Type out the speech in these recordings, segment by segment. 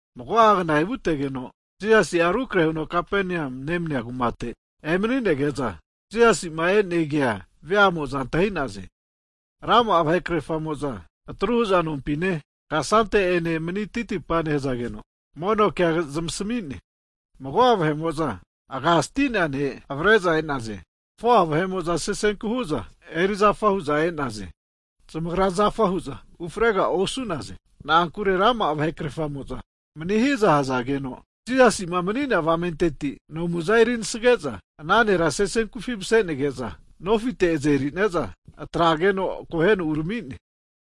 Mago'a kna evutegeno Jisasi'a rukrahe huno Kapanea nemania kumate emani'nege'za, Jisasi'ma e'ne kea vea'mo'za antahi'naze. Rama'a vahe krerfamo'za atru hu'za nompine kasante'ene mani titipa nehzageno, mono kea zamasmi'ne. Mago'a vahe'mo'za aga sti'nea ne' avare'za e'naze. 4'a vahe'mo'za sesenku hu'za erizafa hu'za e'naze. Zamagra zafahu'za ufrega osu'naze, na'ankure rama'a vahe krefamo'za manihiza hazageno, Jisasi'ma mani'nea avamenteti nomuza eri anasege'za, ana nera sesenkufi mase'nege'za nofite azerineza atrageno akoheno urami'ne.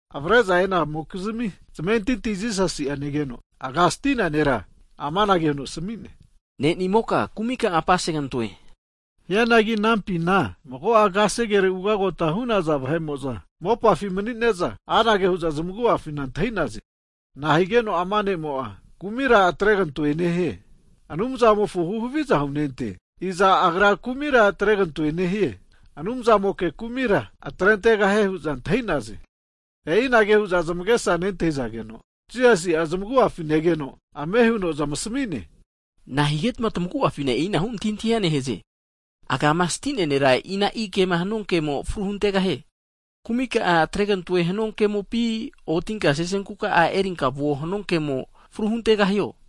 Avare'za e'namokizmi zamentinti Jisasi'a negeno, aga sti'nea nera amanage huno asami'ne, Ne'nimoka kumika'a apasegantoe. Hianagi anampina mago'a kasere ugagota hu'naza vahe'mo'za mopafi mani'ne'za, anage hu'za zmagu'afina antahi'naze. Na'a higeno ama ne'mo'a kumira atregantoe nehie? Anumzamofo huhaviza hunente! Iza Agra kumira atregantoe nehie, Anumzamoke kumira atrentegahie hu'za antahinaze? E'i anage hu'za zamagesa nentahizageno, Jisasi'a zmagu'afi negeno, ame huno zmasami'ne, Na'a higetma tamaguafina e'inahu antahintahia nehaze? Agama sti'nea nera ina'i kema hanua kemo fru huntegahie. Kumi ka'a atregantoe hanua kemopi, ontinka sesenku ka'a erinka vuo hanua kemo fru huntegahio?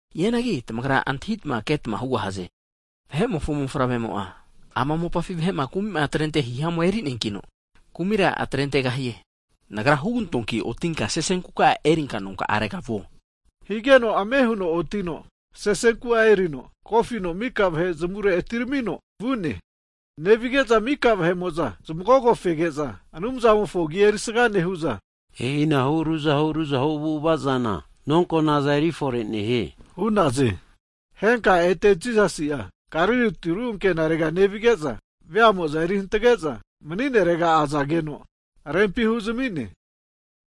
Hianagi tamagra antahitma ketma hugahaze. Vahe'mofo Mofavremo'a, ama mopafi vahe'ma kumi'ma atrente hihamua erineankino, kumira atrentegahie. Nagra hugantoanki otinka sesenkuka'a erinka nonka'arega vuo. Higeno ame huno otino sesenku'a eri kofino mika vahe zamure atiramino vu'ne. Nevige'za mika vahe'mo'za zamagogo fege'za, Anumzamofo agi erisaga nehu'za, e'inahu ruzahu ruzahu avu'avazana nonkonaza erifore nehie, hu'naze. Henka ete Jisasi'a Galili tiru ankenarega nevige'za, veamo'za eri hantage'za mani'nerega azageno rempi huzami'ne.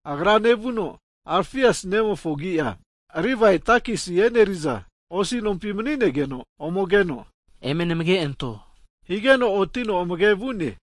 Agra nevuno Alfiasi nemofo agi'a Livai takisi e'neriza osi nompi mani'negeno ome keno, eme namage anto higeno otino amage vu'ne.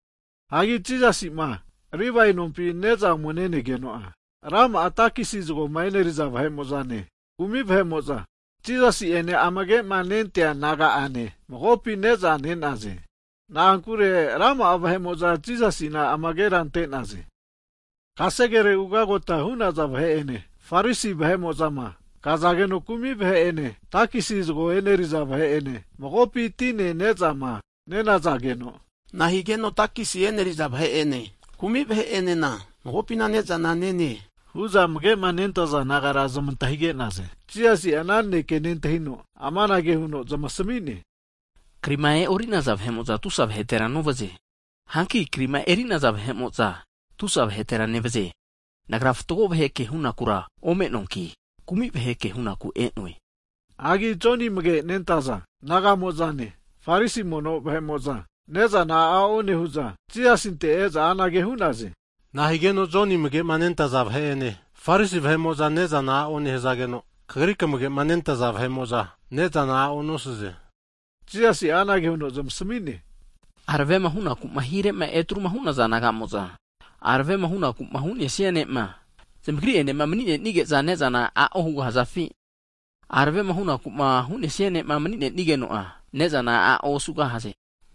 Hagi Jisasi'ma Livai nompi ne'za ome ne'negeno'a, rama'a takesi zagoma eneriza vahe'mo'zane, kumi vahe'mo'za Jisasi'ene amage'ma nentea disaipol naga'ane magopi ne'za ne'naze. Na'ankure rama'a vahe'mo'za Jisasina amagera ante'naze. Kasere ugagota hu'naza vahe'ene, Farisi vahe'mo'zama, kazageno kumi vahe ene takisi zgo e'neriza vahe'ene, magopi tine nezama nenazageno, na'a higeno takesi e'neriza vahe'ene kumi vahe'enena magopina ne'zana nene? Hu'za amage'ma nentaza disaipol nagara zmantahige'naze. Jisasi'a ana naneke nentahino amanage huno zamasmi'ne, krima e'orinaza vahe'mo'za tusa vahetera novaze. Hanki krima eri'naza vahe'mo'za tusa vahetera nevaze. Nagra fatgo vahe kehunakura omenoanki, kumi vahe kehuku e'noe. Hagi Joni amage'ma nentaza disaipol nagamo'zane, Farisi mono vahe'mo'za, ne'zana a'o nehu'za Jisasinte e'za anage hu'naze. Na'a higeno Joni amage'ma nentaza disaipol vahe'ene Farisi vahe'mo'za ne'za a'o nehazageno, Kagri kamagema nentaza disaipol vahe'mo'za ne'zana a'o nosaze? Jisasi'a anage huno zmasami'ne, aravema hunakuma hirema etruma hu'naza nagamo'za aravema hunaku hu'nesia ne'ma zamagri enema mani'nenige'za ne'zana a'o hugahazafi? Aravema hu'naku hu'nesia ne'ma mani'nenigeno'a, ne'zana a'o osugahaze.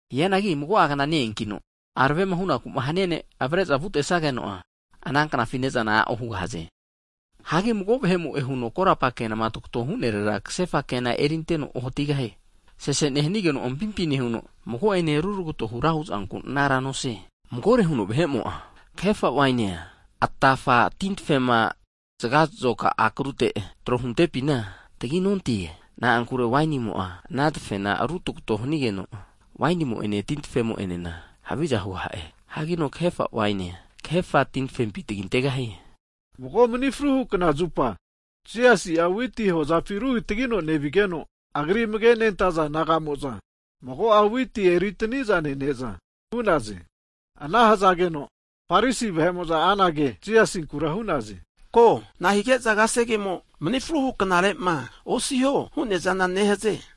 Hianagi mago'a kna ne-eankino, aravema hunaku hania ne'ma avare'za vutesageno, ana knafi ne'zana a'o hugahaze. Hagi mago vahe'mo'e huno korapa kenama tagato hu'nerera kasefa tavravea erinteno ohatigahie. Sese nehanigeno ampimpi nehuno mago'ene ruragato hura hu'zanku anaranosie. Magore huno vahe'mo'a kahefa wainia, atafa tintafema zgakfa akrute tro huntepina taginonte. Na'ankure wainimo'a ana tafena rutagato hanigeno, wainimo'ene ana tintafemo'enenena haviza hugaha'e. Hagino kahefa waini'a kahefa tintafempi tagintegahie. Mago mni fruhu knazupa Jisasi'a witi hozafi rukitagino nevigeno, Agri amage'ma nentaza disaipol naga'mo'za mago'a witi eritaniza nene'za vu'naze. Ana hazageno Farisi vahe'mo'za anage Jisasinkura hu'naze. Ko, na'a hige'za kasegemo mni fruhu knazupa osiho hu'neazana nehaze?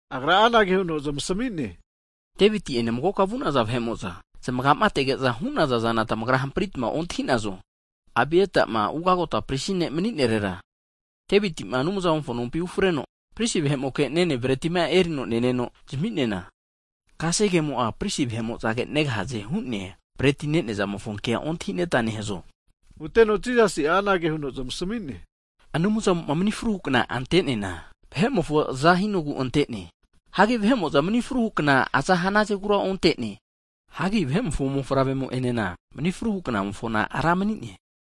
Agra anage huno zmasami'ne, Deviti ene magoka vu'naza vahe'mo'za, zmaga'ma atege'za hu'naza zana tamagra hampritma ontahinazo? Abiatama, ugagota Prisima maninerera, Deviti'ma Anumzamofo nompi ufreno, prisi vahe'moke nenea bretia erino neneno zami'neana, kasegemo'a prisi vahe'mo'zage negahaze hu'nea bretia ne'neazamofo kea ontahineta nehazo? Huteno Jisasi'a anage huno zmasami'ne, Anumza'mo'ma mni fruhu knama anteneana, vahe'mofo aza hinogu antene. Hagi vahe'mo'za mni fruhu kna aza hanazagura ontene. Hagi Vahe'mofo Mofavremo enena mni fruhu knamofona ra mani'ne.